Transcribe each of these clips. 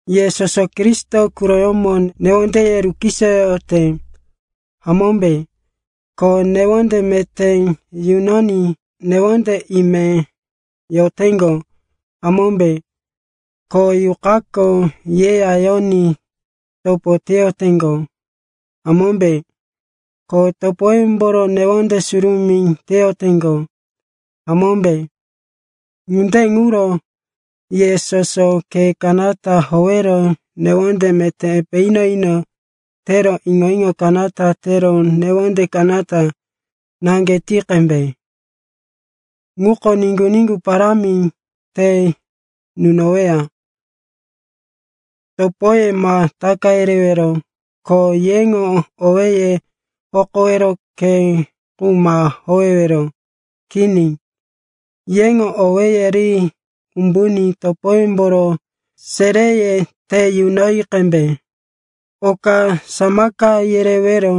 Ye soso Kristo quroyómo newondeye rukisoyoyote, hamómbe? Ko newonde meté yunoní newonde ime yoteŋgo, hamómbe? Ko Yuqako yeya yoní topo teyoteŋgo, hamómbe? Ko topoyemboro newonde surumí teyoteŋgo, hamómbe? Ŋunde ŋuro ye soso khe kanata howero newonde meté epe ino-ino tero iŋo-iŋo kanata tero newonde kanata naŋge ti qembe. Ŋuko niŋgu-niŋgu parámi te nunoweya. Topoye ma taka yerewero, ko yeŋo owéye hokowero khe qu ma howewero. Kini, yeŋo owéye ri umbuní topoyemboro seréye te yunoyi qembe. Oka samaka yerewero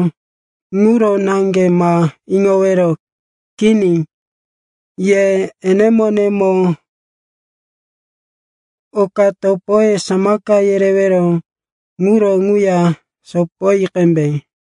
quro naŋge ma iŋowero. Kini, ye enemo-enemo oka topoye samaka yerewero ŋuro ŋuya sopoyi qembe.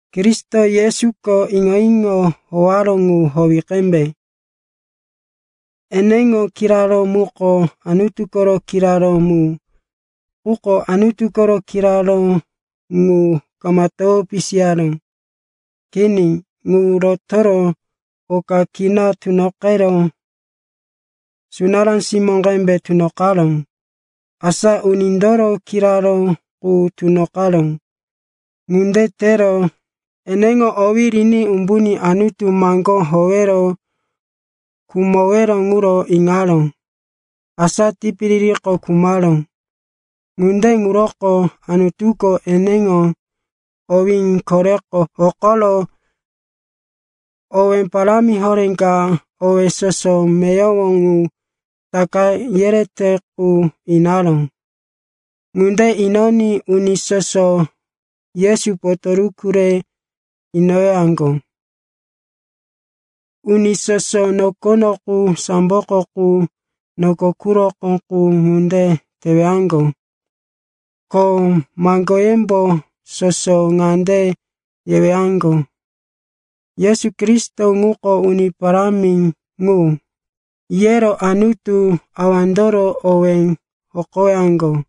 Kristo Yesuko iŋo-iŋo howaró ŋu howi qembe. Eneŋo kiraró muko Anutu koro kiraró mu. Quko Anutu koro kiraró ŋu kama towo pisiyaró. Kini, ŋu rotoro oka kina tunoqero, sunará simó qembe tunoqaró, asa unindoro kiraró qu tunoqaró. Ŋunde tero eneŋo owí riní umbuní Anutu maŋgó howero khumowero ŋuro iŋaró. Asa tipiririko khumaró. Ŋunde ŋuroko Anutuko eneŋo owí koreko hokoro owe parámi horé ka owé soso meyowo ŋu taka yerete qu inaró. Ŋunde inoní uni soso Yesu potoruku re inowaŋgo, uni soso nokono qu, samboko qu, noko quroko qu ŋunde tewaŋgo. Ko maŋgoyembo soso ŋande yewaŋgo, “Yesu Kristo ŋuko Uni Parámi ŋu,” yero Anutu Awandoro owí hokowaŋgo.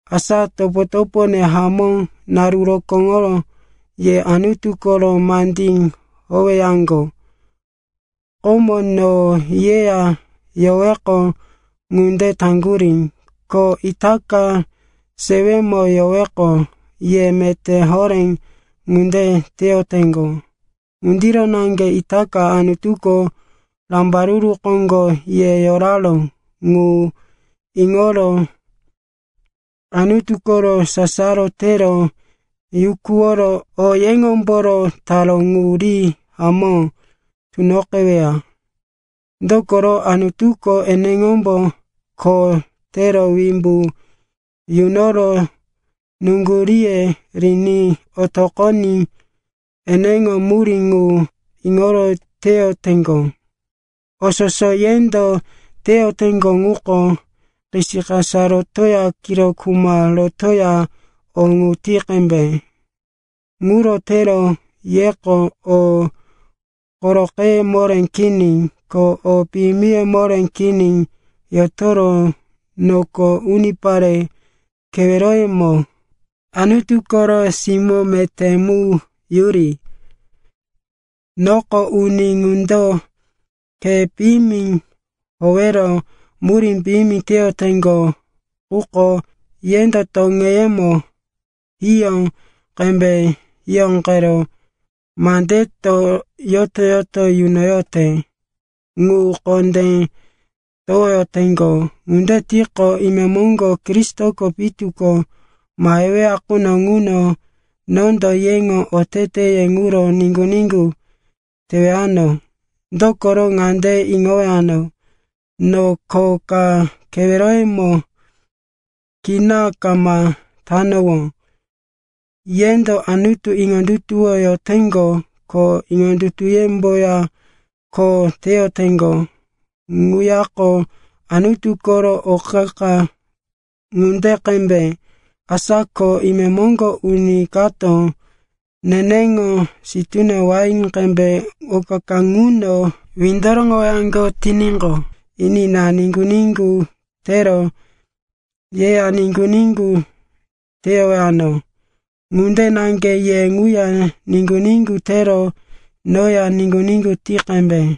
Asa, topo-topone hamó, naru rokóŋo ye Anutu koro mandí howeyaŋgo; komo no yeya yoweqo ŋunde taŋgurí, ko itaka sewemo yoweqo ye meté horé ŋunde teyoteŋgo. Ŋundiro naŋge itaka Anutuko rambaruru koŋgo ye yoraró ŋu iŋoro Anutu koro sasaro tero yukuworo o yeŋomboro taró ŋu ri hamó tunoqeweya. Dokoro Anutuko eneŋombo kho tero wimbu yunoro nuŋguríye riní otoqoní eneŋo murí ŋu iŋoro teyoteŋgo. O soso yendo teyoteŋgo ŋuko, kisikasa rotoya kiro kuma rotoya o ŋu ti qembe. Ŋuro tero yeko o koroqeye moré kini ko o piyimiye moré kini yotoro noko unipare keweroyemo Anutu koro simó meté mu yuri. Noko uni ŋundo khe piyimi howero murí piyimi teyoteŋgo, quko yendo toŋeyemo hiyó qembe hiyóqero mandeto yoto-yoto yunoyote ŋu kondé towoyoteŋgo. Ŋunde tiqo, imemoŋgo, Kristoko pitu ko maheweya quno ŋuno, nondo yeŋo oteteye ŋuro niŋgu-niŋgu tewano. Dokoro ŋande iŋowano, no kho ka keweroyemo kina kama tanowó. Yendo Anutu iŋondutuwoyoteŋgo, ko iŋondutuyemboya kho teyoteŋgo ŋuyako Anutu koro o qa-qa ŋunde qembe. Asa ko imemoŋgo uni kato neneŋo sitúne wain qembe o qa-qa ŋuno windoroŋowaŋgo tiníqo, enina, niŋgu-niŋgu tero yeya niŋgu-niŋgu teyowano. Ŋunde naŋge ye ŋuya niŋgu-niŋgu tero noya niŋgu-niŋgu ti qembe.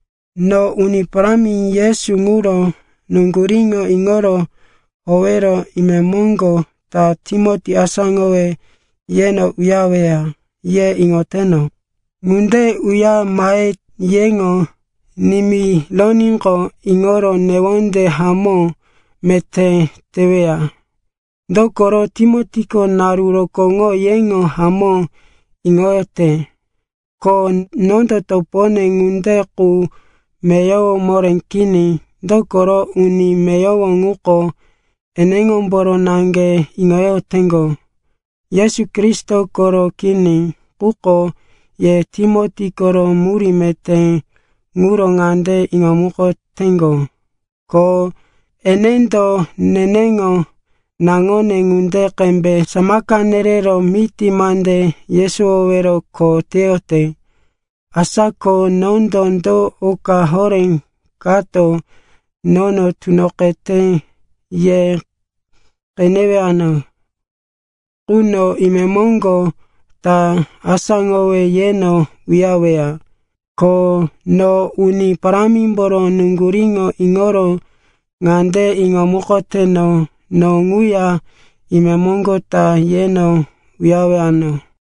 No Uni Parámi Yesu ŋuro nuŋguríŋo iŋoro howero, imemoŋgo ta Timoti asáŋowe yeno uyareweya, ye iŋoteno. Ŋunde uyare mahe yeŋo nimironíqo, iŋoro newondene hamó meté teweya. Dokoro Timotiko naru rokóŋo yeŋo hamó iŋoyote. Ko nondo topone ŋunde qu meyowo moré kini. Dokoro uni meyowo ŋuko eneŋomboro naŋge iŋoyoteŋgo, Yesu Kristo koro kini. Quko ye Timoti koro murí meté ŋuro ŋande iŋomukoteŋgo, ko enendo neneŋo naŋone ŋunde qembe samaka nerero miti mande yesowowero kho teyote. Asa ko nondo do oka horé kato nono tunoqete ye qenewano quno, imemoŋgo ta asáŋowe yeno uyareweya. Ko no Uni Parámimboro nuŋguríŋo iŋoro ŋande iŋomukoteno, no ŋuya imemoŋgo ta yeno uyarewano.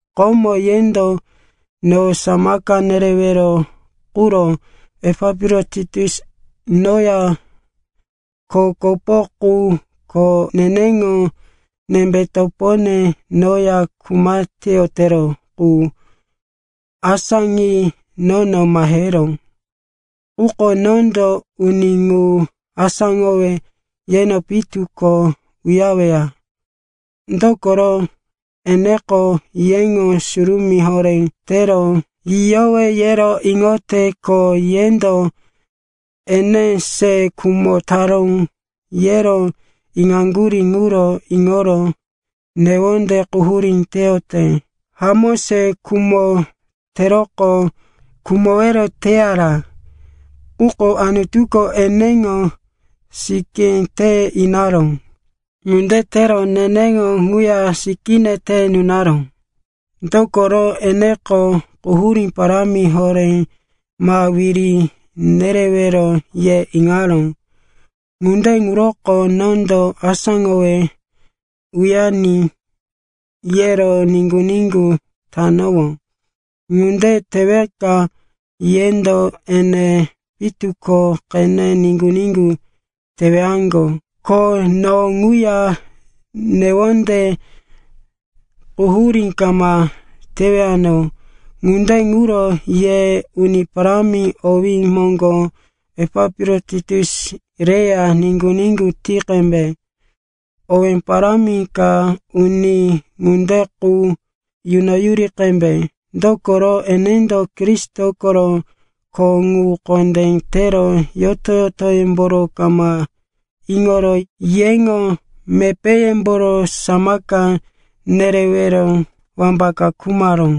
Komo, yendo no samaka nerewero quro Epapirotitus, noya kho kopo qu ko neneŋo nembe topone noya kuma teyotero qu, asáŋi nono maheró. Quko nondo uni ŋu asáŋowe yeno pitu ko uyareweya. Dokoro eneko yeŋo surumí horé tero yiyowe, yero iŋote. Ko yendo, ene se khumo taró, yero iŋaŋgurí ŋuro iŋoro newondí quhurí teyote. Hamó se khumo teroqo khumowero teyara. Quko Anutuko eneŋo sikí te inaró. Ŋunde tero neneŋo ŋuya sikíne te nunaró, dokoro, eneko quhurí parámi horé ma wiri nerewero, ye iŋaró. Ŋunde ŋuroko nondo asáŋowe uyariní yero niŋgu-niŋgu tanowó. Ŋunde teweka yendo ene pitu ko qene niŋgu-niŋgu tewaŋgo, ko no ŋuya newonde quhurí kama tewano. Ŋunde ŋuro ye Uni Parámi owí moŋgo Epapirotitus reya niŋgu-niŋgu ti qembe. Owé parámi ka uni ŋunde qu yunoyuri qembe. Dokoro enendo Kristo koro kho qu kondé tero yoto-yotoyómboro kama iŋoro yeŋo mepéyemboro samaka nerewero wambaka khumaró.